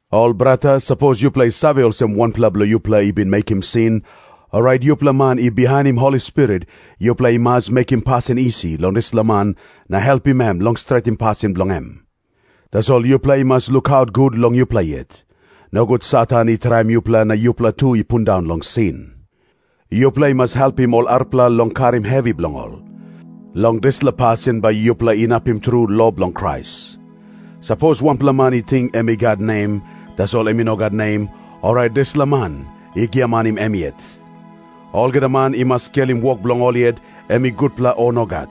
Ol brata, sapos yupela i save olsem wanpela bilong yupela i bin mekim sin, orait yupela man i bihainim Holi Spirit, yupela i mas mekim pasin isi long dispela man na helpim em long stretim pasin bilong em. Tasol yupela i mas lukaut gut long yupela yet. Nogut Satan i traim yupela na yupela tu i pundaun long sin. Yupela i mas helpim ol arapela long karim hevi bilong ol. Long dispela pasin bai yupela inapim tru lo bilong Krais. Sapos wanpela man i ting em i gat nem, tasol em i no gat nem, orait dispela man i giamanim em yet. Olgeta man i mas skelim wok bilong ol yet, em i gutpela o nogat.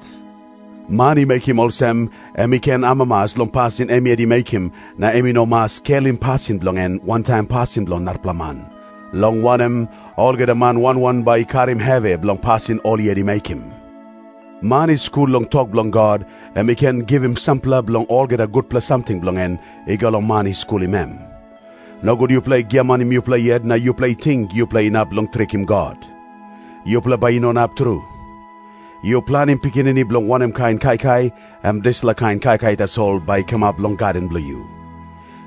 Man i mekim olsem, em i ken amamas long pasin em yet i mekim na em i no mas skelim pasin bilong en wantaim pasin bilong narapela man, long wanem, olgeta man wan wan bai i karim hevi bilong pasin ol yet i mekim. Man i skul long tok bilong God, em i ken givim sampela bilong olgeta gutpela samting bilong en i go long man i skulim em. Nogut yupela i giamanim yupela yet na yupela i ting yupela inap long trikim God. Yupela bai i no inap tru. Yu planim pikinini bilong wanem kain kaikai, em dispela kain kaikai tasol bai i kamap long gaden bilong yu.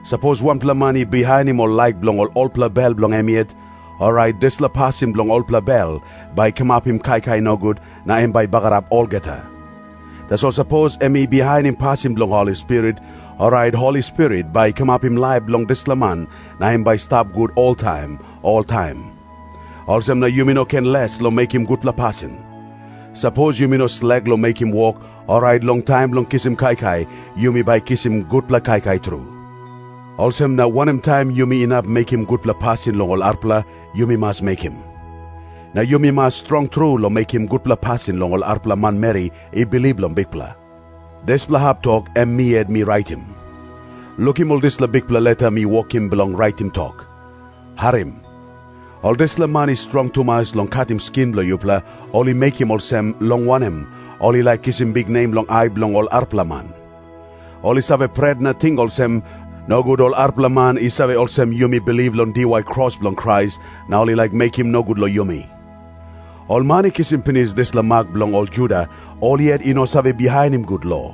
Sapos wanpela man i bihainim ol laik bilong olpela bel bilong em yet, orait dispela pasin bilong olpela bel bai i kamapim kaikai nogut na em bai i bagarap olgeta. Tasol sapos em i bihainim pasin bilong Holi Spirit, orait Holi Spirit bai i kamapim laip long dispela man na em bai i stap gut oltaim oltaim. Olsem na yumi no ken les long mekim gutpela pasin. Sapos yumi no slek long mekim wok, orait long taim bilong kisim kaikai yumi bai kisim gutpela kaikai tru. Olsem na wanem taim yumi inap mekim gutpela pasin long ol arapela, yumi mas mekim. Na yumi mas strong tru long mekim gutpela pasin long ol arapela manmeri i bilip long Bikpela. Dispela hap tok em mi yet mi raitim. Lukim ol dispela bikpela leta mi wokim bilong raitim tok. Harim. Ol dispela man i strong tumas long katim skin bilong yupela, ol i mekim olsem, long wanem, ol i laik kisim biknem long ai bilong ol arapela man. Ol i save pret na ting olsem, “Nogut ol arapela man i save olsem yumi bilip long diwai kros bilong Krais, na ol i laik mekim nogut long yumi.” Ol man i kisim pinis dispela mak bilong ol Juda, ol yet i no save bihainim gut lo.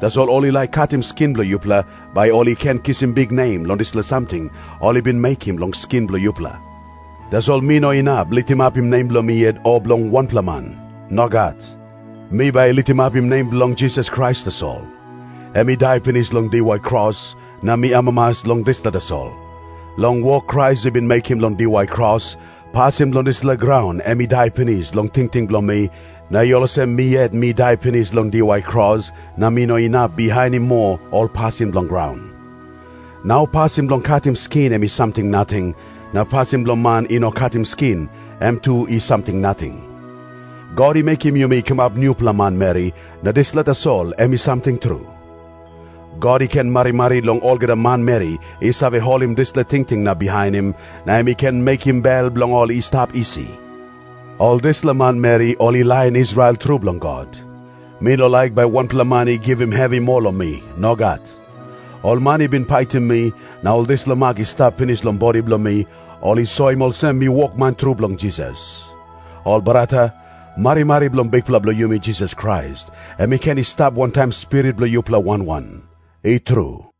Tasol ol i laik katim skin bilong yupela, bai ol i ken kisim biknem long dispela samting ol i bin mekim long skin bilong yupela. Tasol mi no inap litimapim nem bilong mi yet o bilong wanpela man. Nogat. Mi bai litimapim nem bilong Jisas Krais tasol. Em i dai pinis long diwai kros, na mi amamas long dispela tasol. Long wok Krais i bin mekim long diwai kros, pasin bilong dispela graun em i dai pinis long tingting bilong mi, na i olsem mi yet mi dai pinis long diwai kros na mi no inap bihainim moa ol pasin bilong graun. Nau pasin bilong katim skin em i samting nating, na pasin bilong man i no katim skin, em tu i samting nating. God i mekim yumi i kamap nupela manmeri, na dispela tasol em i samting tru. God i ken marimari long olgeta manmeri i save holim dispela tingting na bihainim, na em i ken mekim bel bilong ol i stap isi. Ol dispela manmeri ol i lain Israel tru bilong God. Mi no laik bai wanpela man i givim hevi moa long mi. Nogat. Ol man i bin paitim mi, na ol dispela mak i stap pinis long bodi bilong mi, ol i soim olsem mi wokman tru bilong Jisas. Ol brata, marimari bilong Bikpela bilong yumi Jisas Krais em i ken i stap wantaim spirit bilong yupela wan wan. I tru.